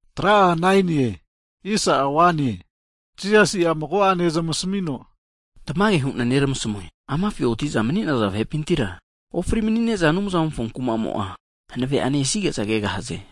Hagi Jisasi'a mago'ane zamasamino, Tamage hu'na neramasmue, amafi otiza mani'naza vahepintira, ofri mani'ne'za Anumzamofo kumamo'a hanave'ane esige'za kegahaze.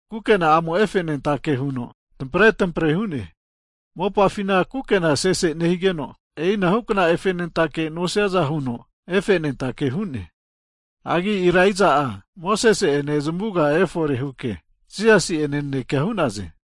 kukena'amo'a efe anentake huno tampre tampre hu'ne. Mopafina kukena sese nehigeno e'inahukna efenentake nosiaza huno efenentake hu'ne. Hagi Elaija'a Mosesi'ene zamavuga efore huke Jisasi'ene naneke hu'naze.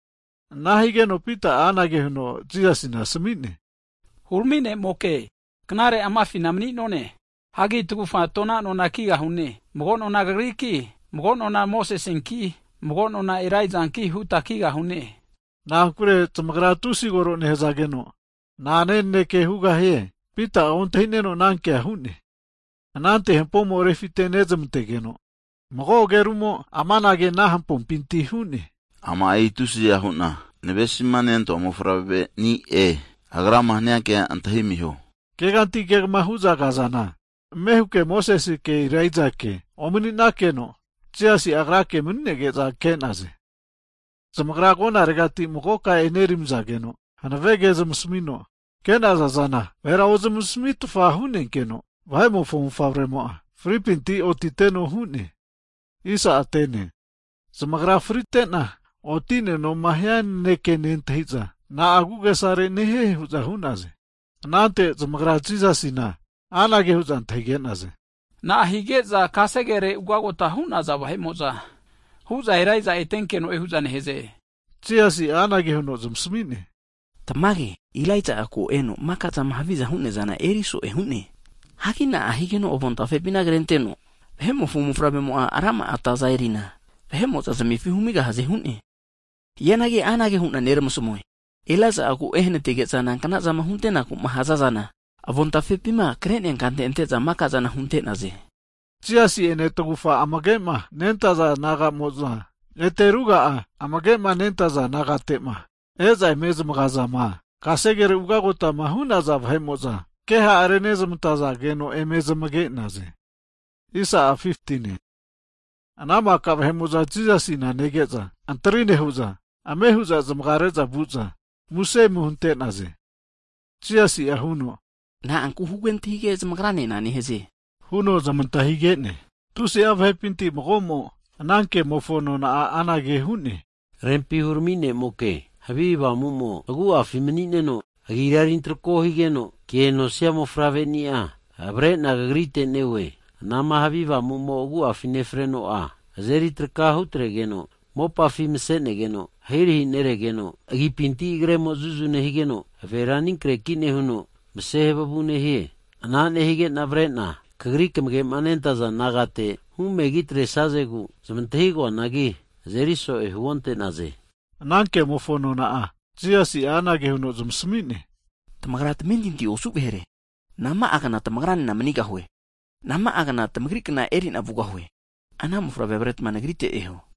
Ana higeno Pita'a anage huno Jisasina asami'ne, Hurami' ne'moke, knare amafina mani'none. Hagi tagufa tona nona kigahune. Mago nona Kagriki, mago nona Mosesinki, mago nona Elaijanki huta kigahune. Na'ankure zamagra tusi koro nehazageno, na'ane naneke hugahie, Pita'a ontahineno ana kea hu'ne. Anante hampomo refitenezmantegeno, mago agerumo amanage ana hampompinti hu'ne, ama'i tusiza hu'na navesima nentoa Mofavreni'e. Agrama hania kea antahi amiho! Hagi keganti kegma hu'za kazana, ame huke Moseke Elaijake omani'nakeno, Jisasi'a Agrake mani'nege'za ke'naze. Hagi zamagrama agonaregati magoka eneramizageno hanave ke zamasamino, ke'naza zana vahera ozmasamitfa hu'nenkeno, Vahe'mofo Mofavremo'a fripinti otiteno hu'ne. Hagi fritena otigahema hia nanekema zamagra'a nentahiza, na agu'agesare nehie hu'za hu'naze. Anante zamagra Jisasina anage hu'za antahige'naze, na'a hige'za kasegere ugagota hu'naza vahe'mo'za, hu'za Elaija'a etenkeno'e hu'za nehaze? Jisasi'a anage huno zamasami'ne, Tamage Elaija ko eno maka'zama haviza hu'neazana eriso'e hu'ne. Hagi na'a higeno avontafepina krenteno, Vahe'mofo Mofavremo'a rama'a ataza erina, vahe'mo'za zamefi humigahaze hu'ne? Hianagi anage hu'na neramasamue, Elaija'a ko' ehanatige'za nanknazama hunte'naku'ma haza'zana avontafepima kre'nea kante ante'za maka'zana hunte'naze. Jisasi'ene tagufa amage'ma nentaza disaipol naga'mo'zama, ete ruga'a amage'ma nentaza disaipol nagatema, e'za eme zamagazana kasegere ugagota hu'naza vahe'mo'za keha renezmantazage'za eme zamage'naze. Anante ana maka vahe'mo'za Jisasina nege'za antri nehu'za, ame hu'za zamagare'za vu'za muse ome hunte'naze. Jisasi'a huno, Na'anku kehara zamagranena nehaze huno zamantahige'ne? Tusi'a vahepinti mago'mo ana kemofo nona'a anage hu'ne, Rempi hurami ne'moke, havi avamumo agu'afi mani'neno agira eri antrako higeno, ke nosia mofavreni'a avarena Kagrite neoe. Anama havi avamu'mo'ma agu'afi nefreno'a azeri traka hutregeno mopafi masenegeno, ahirahi neregeno agipinti agremo zuzu nehigeno, avera anikreki nehuno mase havavu nehie. Ana nehige'na avre'na Kagri kamage'ma nentaza disaipol nagate havi avamu humegi atresazegu zamantahigo'anagi, azeri so'e huonte'naze. Ana kemofo nona'a Jisasi'a anage huno zamasami'ne, Tamagra tamentinti osu vahere! Nama'a gna tamagra nena manigahue? Nama'agna tamagri kna erina vugahue? Ana mofavre avaretma Nagrite eho.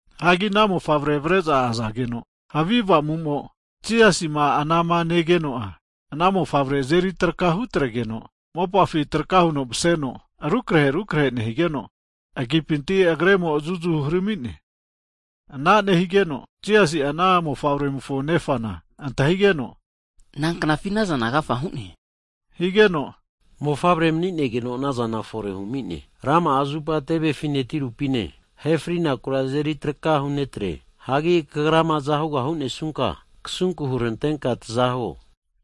Hagi ana mofavre avare'za azageno, havi avamumo Jisasima anama negeno'a, ana mofavre azeri traka hutregeno mopafi traka huno maseno rukre rukre nehigeno, agipintira agremo'a zuzu hurami'ne. Ana nehigeno Jisasi'a ana mofavremofo nefana antahigeno, Nanknafi ana zana agafa hu'ne? Higeno, mofavre mani'negeno anazana fore humine huno hu'ne. Rama'a zupa tevefine tirupine ahefri'naku azeri traka hunetre. Hagi Kagrama azahuga hunesunka, kasunku hurantenka taza huo huno hu'ne.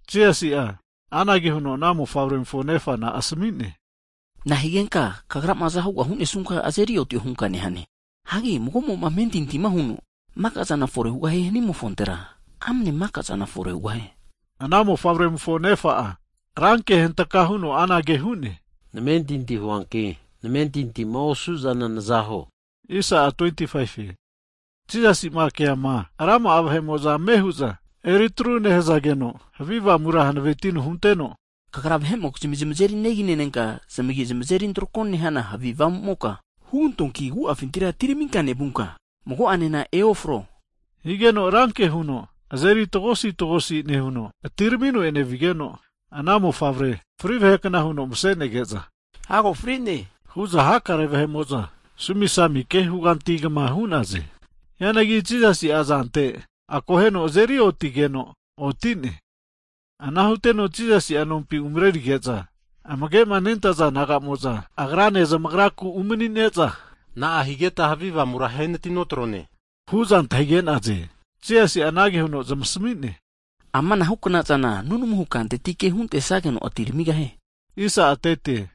Higeno Jisasi'a anage huno ana mofavremofo nefana asami'ne, Na'a higenka kagrama azahuga hunesunka azeri otio hunka nehane? Hagi mago'moma amentinti huno, maka'zana fore hugahie hanimofontera, amane maka'zana fore hugahie. Ana mofavremofo nefa'a ranke huno anage hu'ne, namentinti huanki namentintima osu'zana naza huo! Hagi Jisasi'ma keama rama'a vahe'mo'za ame hu'za eritru nehazageno, havi avamura hanavetino hunteno, Kagra vahe'mokizmi zamazeri negi nenenka zamagi zamazeri antrako nehana havi avamumoka, hugantoanki agu'afintira atiraminka nevunka, mago'anena eofro. Higeno ranke huno azeri tagosi tagosi nehuno atiramino enevigeno, ana mofavremo fri vahekna huno mase'nege'za, hago frine hu'za hakare vahe'mo'za sumi sumi ke hugantigama hu'naze! Hianagi Jisasi'a azante akoheno azeri otigeno oti'ne. Ana huteno Jisasi'a nompi umarerige'za, amage'ma nentaza disaipol naga'mo'za, Agrane zamagraku umani'ne'za, na'a higeta havi avamura ahenati notrone hu'za antahige'naze? Hazageno Jisasi'a anage huno zamasami'ne, Amana huknazana, nunamuhu kantetike huntesageno atiramigahie. Hagi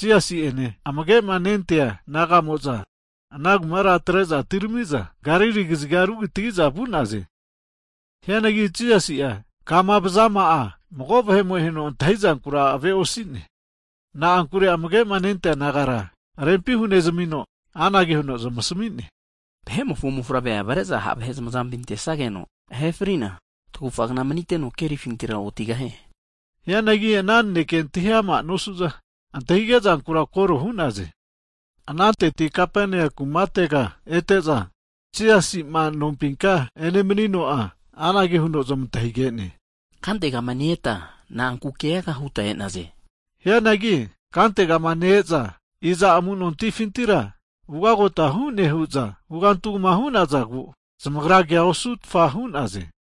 Jisasi'ene amage'ma nentaza disaipol naga'mo'za ana kumara atre'za, atiramiza Galili kaziga rukitagiza vu'naze. Hianagi Jisasi'a kama vazama'a mago vahemo antahi zankura ave'osine. Na'ankure amage'ma nentaza disaipol nagara rempi hunezamino, anage huno zamasami'ne, Vahe'mofo Mofavre avare'za ha' vahe zamazampi antesage'za ahe fritesageno, tagufa kna maniteno kerifintira otigahie. Hianagi ana naneke antahi ama nosu'za, antahige'zankura koro hu'naze. Anantetira Kapaneamu kumatega ete'za, Jisasima nompinka enemanino'a anage huno zamantahige'ne. Kantegama ne-eta na'anku keaga huta e'naze? Hianagi kantegama ne-eza i'za amu'nontifintira ugagota hu'ne hu'za hugantugama hu'nazagu, zamagra kea osutfa hu'naze.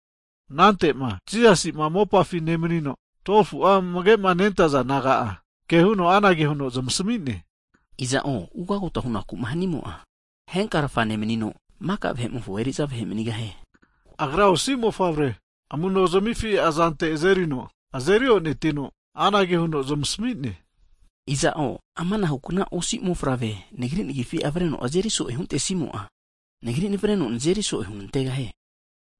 Anante'ma Jisasi'ma mopafima nemanino'a 12fu'a amage'ma nentaza disaipol naga'a, kehuno anage huno zamasami'ne, Iza'o ugagota hunaku'ma hanimo'a, henkarfa nemanino, maka vahe'mofo eriza vahe manigahie. Agra osi mofavre amunozmifi azante azerino azeri onetino, anage huno zamasami'ne. Iza'o amanahu'kna osi mofavre, Nagri nagifi avreno azeri so'e huntesimo'a, Nagri navareno nazeri so'e hunantegahie.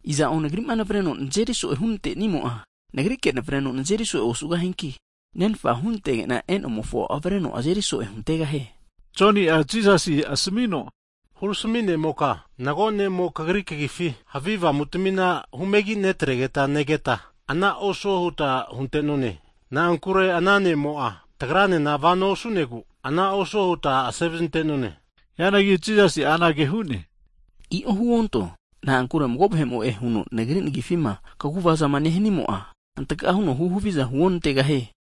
Iza'o Nagri'ma nevareno nazeri so'e hunante'nimo'a, Nagrike navareno nazeri so'e osugahianki, Nenfa hunantege'na e'nomofo avreno azeri so'e huntegahie. Anante Joni'a Jisasina asamino, Hurami ne'moka mago ne'mo kagri kagifi havi avamutamina humegi netregeta negeta, ana osuo huta hunte'none. Na'ankure ana ne'mo'a tagranena vano osu'negu ana osuo huta asevazinte'none. Hianagi Jisasi'a anage hu'ne, I'o huonteho, na'ankure mago vahe'mo'e huno Nagri nagifima kaguvazama nehanimo'a, hantga huno hu haviza hu onantegahie.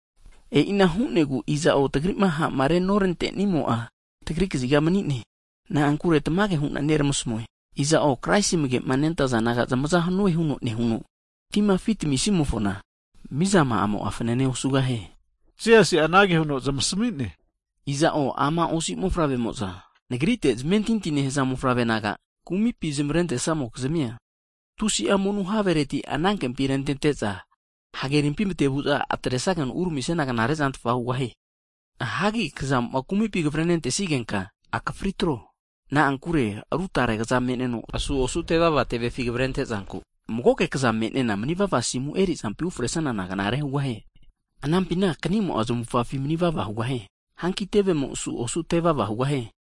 E'ina hu'negu iza'o tagri'ma ha'marema norante'nimo'a, tagri kaziga mani'ne. Na'ankure tamage hu'na neramasamue, iza'o, Kraisi amage'ma nentaza disaipol naga zamaza hanue huno nehuno, tima afi tamisimofona, mizama'amo'a fanane osugahie. Jisasi'a anage huno zamasami'ne, Iza'o ama osi mofavremo'za, Nagrite'ma zamentinti nehaza mofavre nagama kumipi zamarentesamokizmia, tusi'a monu havereti anankempi rentete'za, hagerimpi matevu'za atresageno uramisiana knare'zantfa hugahie. Hagi kazamo'ma kumipi kavare nentesigenka akafri atro. Na'ankure ru tare kaza me'nenigeno asu osu tevava tevefi kavarente zanku, magoke kaza me'nena manivava asimu erisanana knare hugahie. [Anampina kanimo'a zamufgafi manivava hugahie. Hanki tevemo asu osu tevava hugahie.]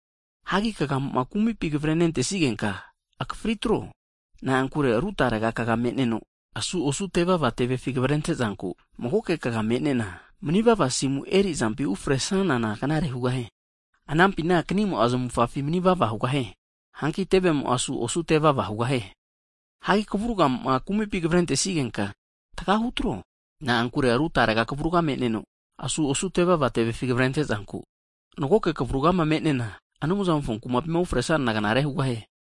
Hagi kagamo'ma kumipi kavare nentesigenka akafri tro, na'ankure ru tare kaga me'neno asu osu tevava tevefi kavarente'zanku, magoke kaga me'nena, manivava asimu erizampi ufresanana knare hugahie. [Anampina kanimo'a zamufgafi manivava hugahie. Hanki tevemo asu osu tevava hugahie.] Hagi kavurgamo'ma kumipi kavare nentesigenka, anankavuraga tagati atro, na'ankure ru tare kavurga me'neno, asu osu tevava tevefi kavretre'zanku, magoke kavurgama me'nena, Anumzamofo kumapima ufresanana knare hugahie.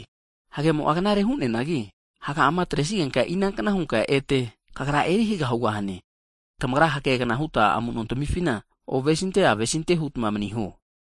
Hagemo'a knare hu'neanagi, haga'ama atresigenka, inankna hunka ete kagra eri haga hugahane? Tamagra hagegna huta amuno tamifina ovesinte avesinte hutma tamarimpa frune maniho.